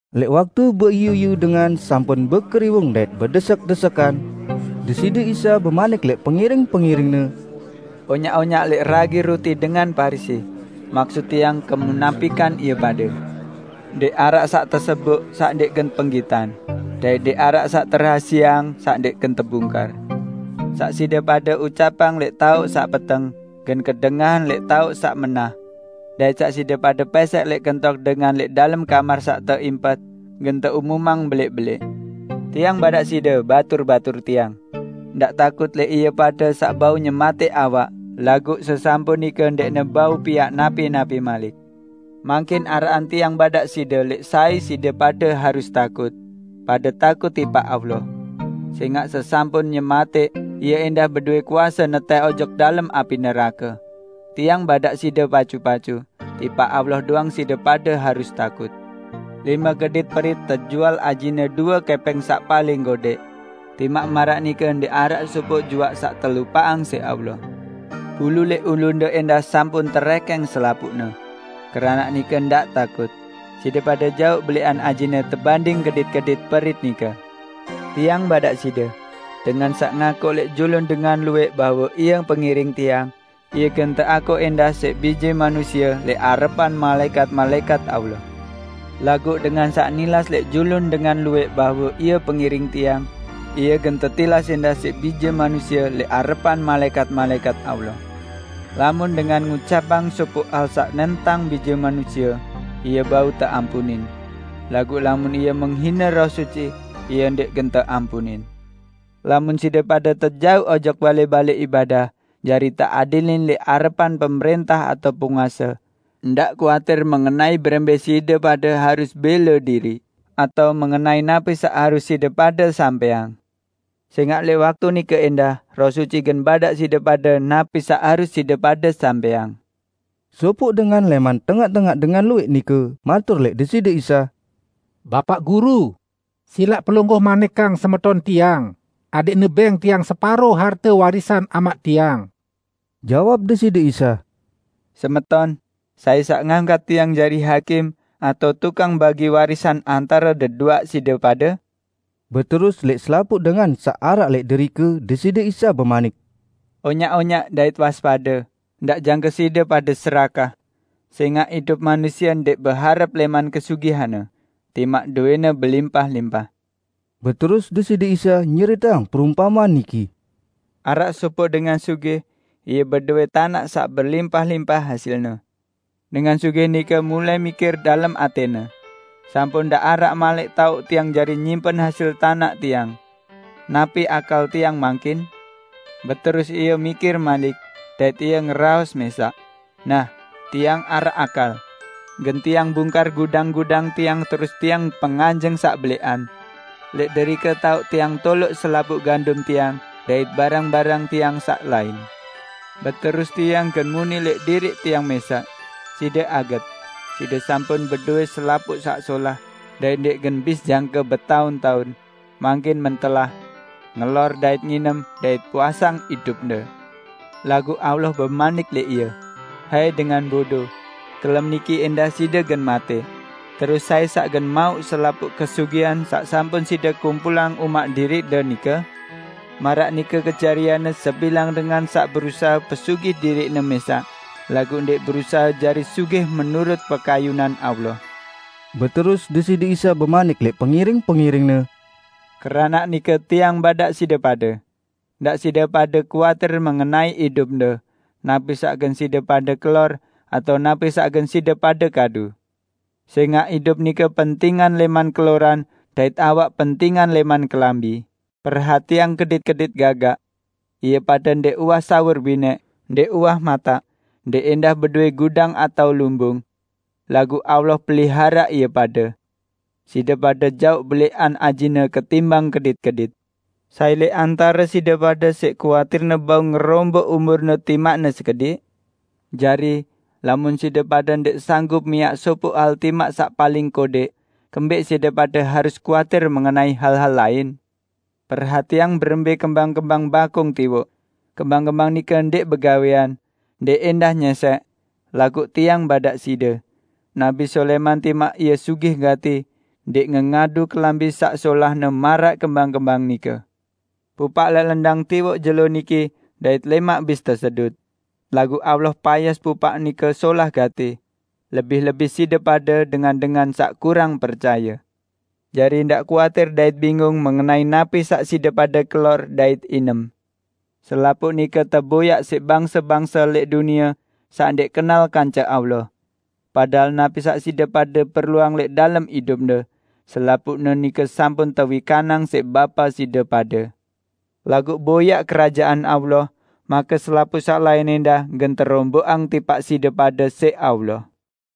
Lẽq waktu beiyu-iyu dengan sampun bekeriwung dait bedesek-desekan, Deside Isa bemanik lẽq pengiring-pengiring-Ne, "Onyaq-onyaq lẽq ragi ruti dengan Parisi, maksut Tiang kemunapikan ie pade. Ndẽq araq saq teseboq saq ndẽq gen penggitan, dait ndẽq araq saq terahasieang saq ndẽq gen tebungkar. Saq side pade ucapang lẽq taoq saq peteng, gen kedengahan lẽq taoq saq menah; dait saq side pade pẽsẽq lẽq kentok dengan lẽq dalem kamar saq teimpet, gen teumumang belẽq-belẽq." "Tiang badaq side, batur-batur Tiang! Ndaq takut lẽq ie pade saq bau nyematẽq awak laguq sesampun nike ndẽqne bau piaq napi-napi malik. Mangkin araqan Tiang badaq side lẽq sai side pade harus takut. Pade takut tipaq Allah! Sẽngaq sesampun nyematẽq, Ie ẽndah bedowe kuase netẽh ojok dalem api nerake! Tiang badaq side pacu-pacu, tipaq Allah doang side pade harus takut. Lime kedit perit tejual ajine due kẽpẽng saq paling kodẽq. Timaq maraq nike ndẽq araq sopoq juaq saq telupaqang siq Allah. Bulu lẽq ulunde ẽndah sampun terẽkẽng selapuqne, keranaq nike ndaq takut; side pade jaoq belẽqan ajine tebanding kedit-kedit perit nike." "Tiang badaq side: Dengan saq ngakuq lẽq julun dengan luwẽq bahwe ie pengiring Tiang, ie gen teakuq ẽndah siq Bije Manusie lẽq arepan malaẽkat-malaẽkat Allah. Laguq dengan saq nilas lẽq julun dengan luwẽq bahwe ie pengiring Tiang, ie gen tetilas ẽndah siq Bije Manusie lẽq arepan malaẽkat-malaẽkat Allah. Lamun dengan ngucapang sopoq hal saq nentang Bije Manusie, ie bau teampunin; laguq lamun ie menghine Roh Suci, ie ndẽq gen teampunin. Lamun side pade tejauq ojok balẽ-balẽ ibadah jari teadilin lẽq arepan pemrẽntah atao penguase, ndaq kuatir mengenai berembẽ side pade harus bẽle diriq atao mengenai napi saq harus side pade sampẽang. Sẽngaq lẽq waktu nike ẽndah Roh Suci gen badaq side pade napi saq harus side pade sampẽang." Sopoq dengan lẽman tengaq-tengaq dengan luwẽq nike matur lẽq Deside Isa, "Bapaq Guru, silaq Pelungguh manikang semeton tiang adẽqne bẽng tiang separo harte warisan amaq tiang." Jawab Deside Isa, "Semeton, sai saq ngangkat Tiang jari hakim atao tukang bagi warisan antare deduaq side pade?" Beterus lẽq selapuq dengan saq araq lẽq derike Deside Isa bemanik, "Onyaq-onyaq dait waspade, ndaq jangke side pade serakah. Sẽngaq idup manusie ndẽq beharep lẽman kesugihanne, timaq dowẽne belimpah-limpah." Beterus Deside Isa nyeriteang perumpamean niki, "Araq sopoq dengan sugih. Ie bedowẽ tanaq saq belimpah-limpah hasilne. Dengan sugih nike mulai mikir dalem atẽne, 'Sampun ndẽq araq malik taoq tiang jari nyimpen hasil tanaq tiang. Napi akal tiang mangkin?' Beterus ie mikir malik, dait ie ngeraos mẽsaq, 'Nah, tiang araq akal; gen tiang bungkar gudang-gudang tiang terus tiang penganjeng saq belẽqan. Lẽq derike taoq tiang toloq selapuq gandum tiang dait barang-barang tiang saq lain. Beterus tiang gen muni lẽq diriq tiang mẽsaq: Side aget! Side sampun bedowẽ selapuq saq solah, dait ndẽq gen bis jangke betaun-taun. Mangkin mentelah! Ngelor dait nginem, dait puasang idupde!' Laguq Allah bemanik lẽq ie, 'Hai dengan bodo! Kelem niki ẽndah side gen matẽ, terus sai saq gen mauq selapuq kesugihan saq sampun side kumpulang umaq diriqde nike?' Maraq nike kejarianne sebilang dengan saq berusahe pesugih diriqne mẽsaq, laguq ndẽq berusahe jari sugih menurut pekayunan Allah." Beterus Deside Isa bemanik lẽq pengiring-pengiring-Ne, "Keranaq nike Tiang badaq side pade, 'Ndaq side pade kuatir mengenai idupde, napi saq gen side pade kelor, atao napi saq gen side pade kadu.' Sẽngaq idup nike pentingan lẽman keloran dait awak pentingan lẽman kelambi. Perhatiang kedit-kedit gagak! Ie pade ndẽq uwah sawur binẽq, ndẽq ẽndah bedowẽ gudang atao lumbung. Laguq Allah peliharaq ie pade! Side pade jaoq belẽqan ajine ketimbang kedit-kedit! Sai lẽq antare side pade siq kuatirne bau ngeromboq umurne timaqne sekediq? Jari, lamun side pade ndẽq sanggup miaq sopoq hal timaq saq paling kodẽq, kembẽq side pade harus kuatir mengenai hal-hal lain? Perhatiang berembẽ kembang-kembang bakung tiwoq; kembang-kembang nike ndẽq begawẽan, ndẽq ẽndah nyẽsẽk, laguq Tiang badaq side: Nabi Sulaiman timaq ie sugih gati, ndẽq ngengadu kelambi saq solahne maraq kembang-kembang nike! Pupaq lẽq lendang tiwoq jelo niki dait lẽmaq bis tesedut. Laguq Allah payas pupaq nike solah gati. Lebih-lebih side pade, dengan-dengan saq kurang percaye! Jari, ndaq kuatir dait bingung mengenai napi saq side pade kelor dait inem. Selapuq nike teboyaq siq bangse-bangse lẽq dunie saq ndẽq kenal kance Allah. Padahal napi saq side pade perluang lẽq dalem idupde, selapuqne nike sampun tewikanang siq Bapa side pade. Laguq boyaq Kerajaan Allah, make selapuq saq lain ẽndah gen teromboqang tipaq side pade siq Allah."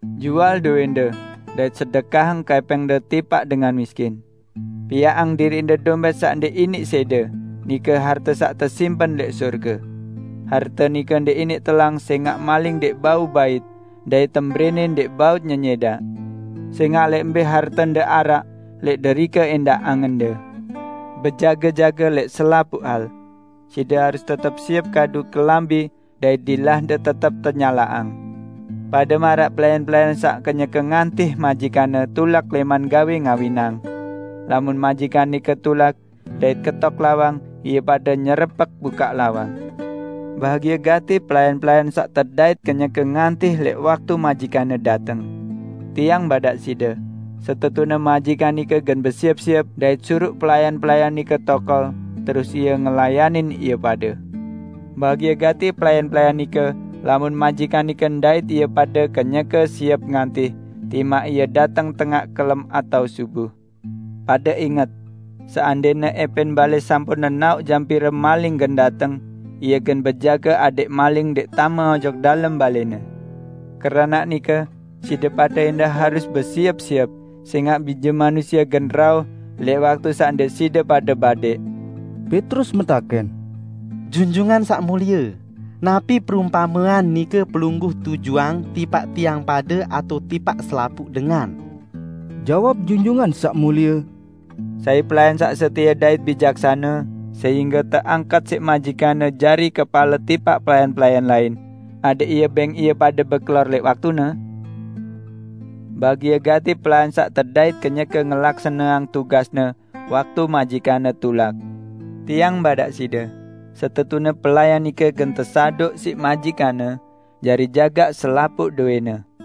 Jual dowẽnde dait sedekahang kẽpẽngne tipaq dengan miskin. Piaqang diriqde dompẽt saq ndẽq iniq sẽde, nike harte saq tesimpen lẽq sorge. Harte nike ndẽq iniq telang sẽngaq maling ndẽq bau bait dait tembrẽnẽ ndẽq bau nyenyẽdaq. Sẽngaq lẽq mbẽ hartende araq, lẽq derike ẽndah angende!" "Bejage-jage lẽq selapuq hal. Side harus tetep siep kadu kelambi dait dilahde tetep tenyalaqang, pade maraq pelayan-pelayan saq kenyeke ngantih majikanne tulak lẽman gawẽ ngawinang. Lamun majikan nike tulak, dait ketok lawang, ie pade nyerepek bukaq lawang. Bahagie gati pelayan-pelayan saq tedait kenyeke ngantih lẽq waktu majikanne dateng. Tiang badaq side: Setetune majikan nike gen besiep-siep dait suruq pelayan-pelayan nike tokol, terus ie ngelayanin ie pade. Bahagie gati pelayan-pelayan nike lamun majikan nike ndait ie pade kenyeke siep ngantih, timaq ie dateng tengaq kelem atao subuh! Pade inget! Seandẽne ẽpẽn balẽ sampun nenaoq jam pire maling gen dateng, ie gen bejage adẽq maling ndẽq tame ojok dalem balẽne. Keranaq nike, side pade ẽndah harus besiep-siep, sẽngaq Bije Manusie gen rauh lẽq waktu saq ndẽq side pade badẽq." Petrus metakẽn, "Junjungan Saq Mulie, napi perumpamean nike Pelungguh tujuang tipaq tiang pade atao tipaq selapuq dengan?" Jawab Junjungan Saq Mulie, "Sai pelayan saq setie dait bijaksane sehingge teangkat siq majikanne jari kepale tipaq pelayan-pelayan lain, adẽq ie bẽng ie pade bekelor lamun sampun wayene? Bahagie gati pelayan saq tedait kenyeke ngelaksaneang tugasne waktu majikanne tulak! Tiang badaq side: Setetune pelayan nike gen tesaduq siq majikanne jari jagaq selapuq dowẽne.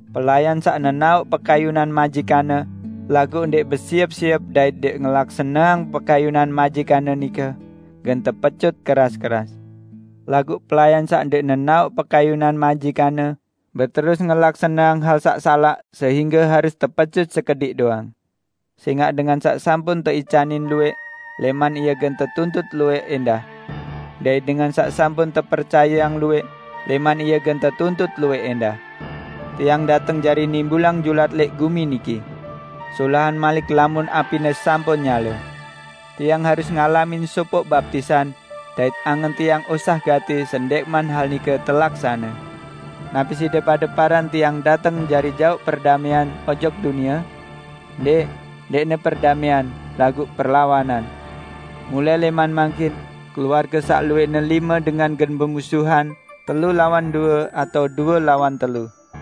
Pelayan saq nenaoq pekayunan majikanne, laguq ndẽq besiep-siep dait ndẽq ngelaksaneang pekayunan majikanne nike, gen tepecut keras-keras. Laguq pelayan saq ndẽq nenaoq pekayunan majikanne, beterus ngelaksaneang hal saq salaq, sehingge harus tepecut sekediq doang. Sẽngaq dengan saq sampun teicanin luwẽq, lẽman ie gen tetuntut luwẽq ẽndah. Dait dengan saq sampun tepercayeang luwẽq, lẽman ie gen tetuntut luwẽq ẽndah." "Tiang dateng jari nimbulang julat lẽq gumi niki. Solahan malik lamun apine sampun nyale! Tiang harus ngalamin sopoq baptisan, dait angen Tiang osah gati sendẽqman hal nike telaksane. Napi side pade paran Tiang dateng jari jauq perdamẽan ojok dunie? Ndẽq, ndẽqne perdamẽan, laguq perlawanan. Mulai lẽman mangkin, keluarge saq luwẽqne lime dengan gen bemusuhan, telu lawan due atao due lawan telu.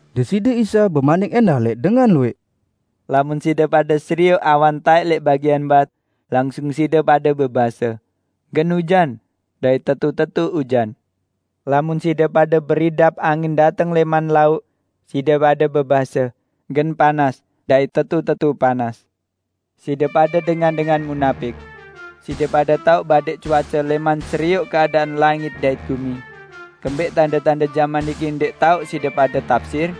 Deside Isa bemanik ẽndah lẽq dengan luwẽq, "Lamun side pade serioq awan taẽk lẽq bagian bat, langsung side pade bebase, 'Gen ujan.' Dait tetu-tetu ujan. Lamun side pade beridap angin dateng lẽman lauq, side pade bebase, 'Gen panas.' Dait tetu-tetu panas. Side pade dengan-dengan munapik! Side pade tao badẽq cuace lẽman serioq keadaan langit dait gumi. Kembẽq tande-tande jaman niki ndẽq tao side pade tapsir?"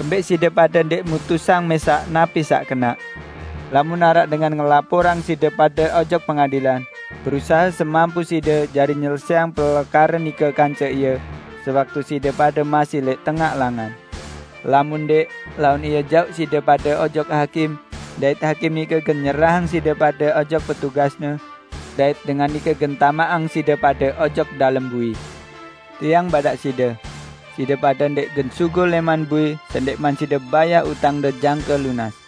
"Kembẽq side pade ndẽq mutusang mẽsaq napi saq kenaq? Lamun araq dengan ngelaporang side pade ojok pengadilan, berusahe semampu side jari nyelesẽang pelekare nike kance ie sewaktu side pade masih lẽq tengaq langan. Lamun ndẽq, laun ie jauq side pade ojok hakim dait hakim nike gen nyerahang side pade ojok petugasne, dait dengan nike gen tamaqang side pade ojok dalem bui. Tiang badaq side: Side pade ndẽq gen sugul lẽman bui sendẽqman side bayah utangde jangke lunas!"